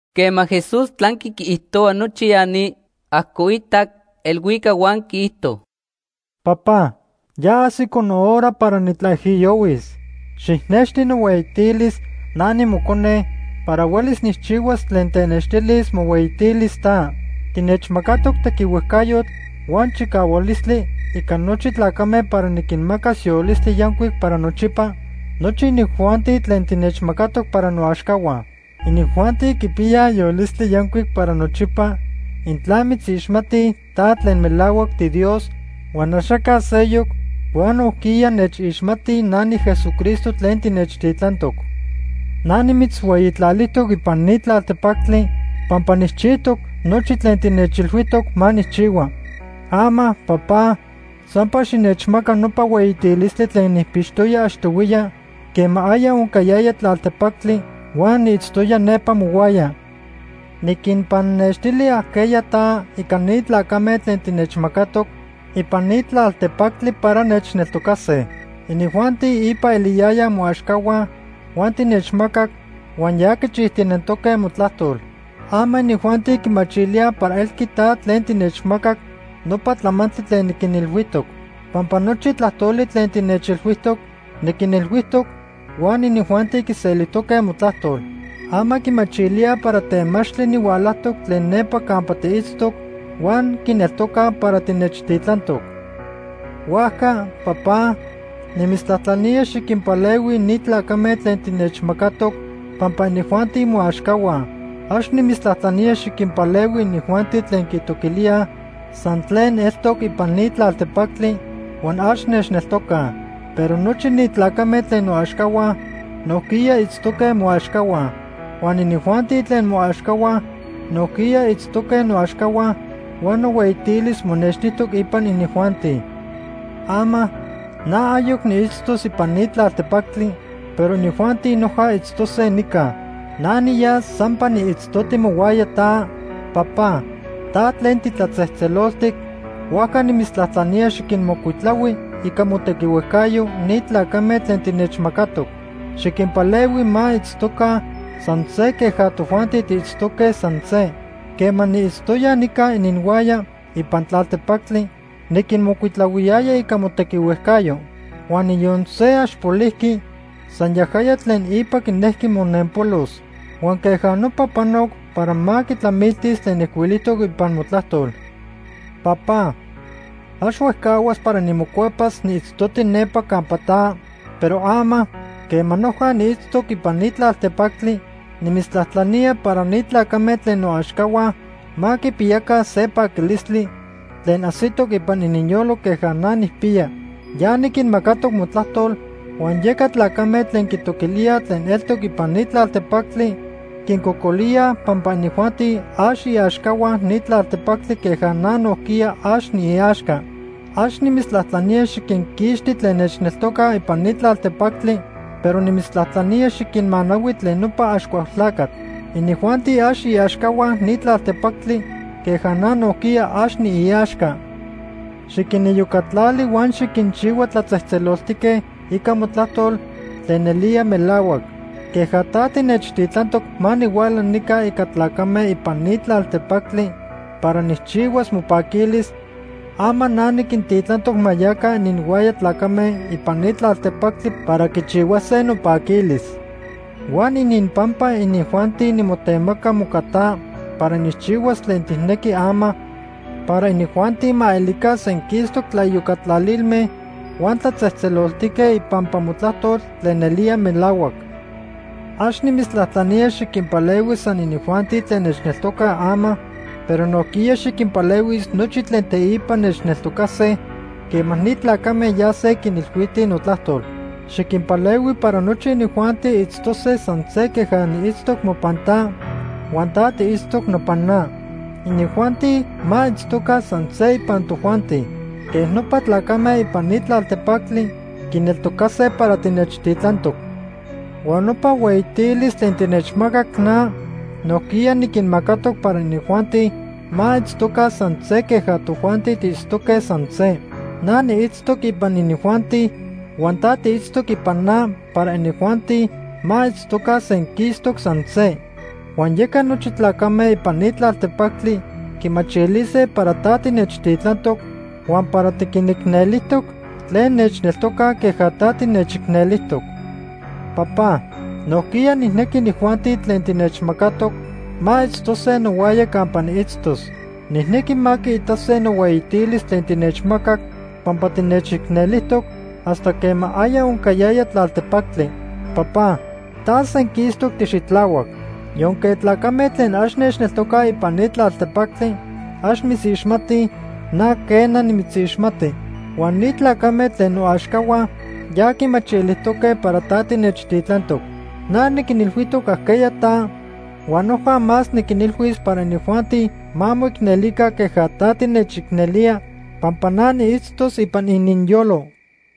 Quema Jesús tlanqui quiijtohua nochi ya ni, ajcoitac elhuicac huan quiijto: “Papá, ya ajsico nohora para nitlaijiyohuis. Xijnexti nohueyitilis, na nimocone, para huelis nijchihuas tlen tenextilis mohueyitilis ta. Tinechmacatoc tequihuejcayotl huan chicahualistli ica nochi tlacame para niquinmacas yolistli yancuic para nochipa nochi inijuanti tlen tinechmacatoc para noaxcahua. Inijuanti quipiyaj yolistli yancuic para nochipa intla mitzixmatij ta tlen melahuac tiDios huan axaca seyoc, huan nojquiya nechixmatij na niJesucristo tlen tinechtitlantoc. “Na nimitzhueyitlalijtoc ipan ni tlaltepactli pampa nijchijtoc nochi tlen tinechilhuijtoc ma nijchihua. Ama, Papá, sampa xinechmaca nopa hueyitilistli tlen nijpixtoya achtohuiya quema aya oncayaya tlaltepactli huan niitztoya nepa mohuaya. “Niquinpannextili ajqueya ta ica ni tlacame tlen tinechmacatoc ipan ni tlaltepactli para nechneltocase. Inijuanti ipa eliyayaj moaxcahua huan tinechmacac huan ya quichijtinentoque motlajtol. Ama inijuanti quimachilíaj para elqui ta tlen tinechmacac nopa tlamantli tlen niquinilhuijtoc. Pampa nochi tlajtoli tlen tinechilhuijtoc, niquinilhuijtoc huan inijuanti quiselijtoque motlajtol. Ama quimachilíaj para temachtli nihualajtoc tlen nepa campa tiitztoc huan quineltocaj para tinechtitlantoc. “Huajca, Papá, nimitztlajtlanía xiquinpalehui ni tlacame tlen tinechmacatoc pampa inijuanti moaxcahua. Ax nimitztlajtlanía xiquinpalehui inijuanti tlen quitoquilíaj san tlen eltoc ipan ni tlaltepactli huan ax nechneltocaj. Pero nochi ni tlacame tlen noaxcahua nojquiya itztoque moaxcahua. Huan inijuanti tlen moaxcahua nojquiya itztoque noaxcahua huan nohueyitilis monextijtoc ipan inijuanti. “Ama, na ayoc niitztos ipan ni tlaltepactli, pero inijuanti noja itztose nica. Na niyas sampa niitztoti mohuaya ta, Papá, ta tlen titlatzejtzeloltic, huajca nimitztlajtlanía xiquinmocuitlahui ica motequihuejcayo ni tlacame tlen tinechmacatoc. Xiquinpalehui ma itztoca san se queja tojuanti tiitztoque san se. Quema niitztoya nica ininhuaya ipan tlaltepactli, niquinmocuitlahuiyaya ica motequihuejcayo. Huan niyon se ax polijqui, san yajaya tlen ipa quinejqui monenpolos. Huan queja nopa panoc para ma quitlamiltis tlen ijcuilijtoc ipan motlajtol. “Papá, ax huejcahuas para nimocuepas niitztoti nepa campa ta, pero ama, quema noja niitztoc ipan ni tlaltepactli, nimitztlajtlanía para ni tlacame tlen noaxcahua ma quipiyaca se paquilistli tlen ajsitoc ipan ininyolo queja na nijpiya. Ya niquinmacatoc motlajtol huan yeca tlacame tlen quitoquilíaj tlen eltoc ipan ni tlaltepactli quincocolíaj pampa inijuanti ax iaxcahua ni tlaltepactli queja na nojquiya ax niiaxca. Ax nimitztlajtlanía xiquinquixti tlen nechneltocaj ipan ni tlaltepactli, pero nimitztlajtlanía xiquinmanahui tlen nopa Axcualtlacatl. Inijuanti ax iaxcahua ni tlaltepactli queja na nojquiya ax niiaxca. Xiquiniyocatlali huan xiquinchihua tlatzejtzeloltique ica motlajtol tlen nelía melahuac. Queja ta tinechtitlantoc ma nihuala nica ica tlacame ipan ni tlaltepactli para nijchihuas mopaquilis, ama na niquintitlantoc ma yaca ininhuaya tlacame ipan ni tlaltepactli para quichihuase nopaquilis. Huan ininpampa inijuanti nimotemaca moca ta para nijchihuas tlen tijnequi ama para inijuanti ma elica senquistoc tlaiyocatlalilme huan tlatzejtzeloltique ipampa motlajtol tlen nelía melahuac. “Ax nimitztlajtlanía xiquinpalehui san inijuanti tlen nechneltocaj ama, pero nojquiya xiquinpalehuis nochi tlen teipa nechneltocase quema ni tlacame yase quinilhuitij notlajtol. Xiquinpalehui para nochi inijuanti itztose san se queja niitztoc mopan ta huan ta tiitztoc nopan na. Inijuanti ma itztoca san se ipan tojuanti. Quej nopa tlacame ipan ni tlaltepactli quineltocase para tinechtitlantoc. Huan nopa hueyitilis tlen tinechmacac na, nojquiya niquinmacatoc para inijuanti ma itztoca san se queja tojuanti tiitztoque san se. Na niitztos ipan inijuanti huan ta tiitztoc ipan na para inijuanti ma itztoca senquistoc san se. Huan yeca nochi tlacame ipan ni tlaltepactli quimachilise para ta tinechtitlantoc huan para tiquinicnelijtoc tlen nechneltocaj queja ta tinechicnelijtoc. “Papá, nojquiya nijnequi inijuanti tlen tinechmacatoc ma itztose nohuaya campa niitztos. Nijnequi ma quiitase nohueyitilis tlen tinechmacac pampa tinechicnelijtoc hasta quema aya oncayaya tlaltepactli. Papá, ta senquistoc tixitlahuac. Yonque tlacame tlen ax nechneltocaj ipan ni tlaltepactli ax mitzixmatij, na quena, nimitzixmati. Huan ni tlacame tlen noaxcahua ya quimachilijtoque para ta tinechtitlantoc. Na niquinilhuijtoc ajqueya ta huan noja más niquinilhuis para inijuanti ma moicnelica queja ta tinechicnelía pampa na niitztos ipan ininyolo.”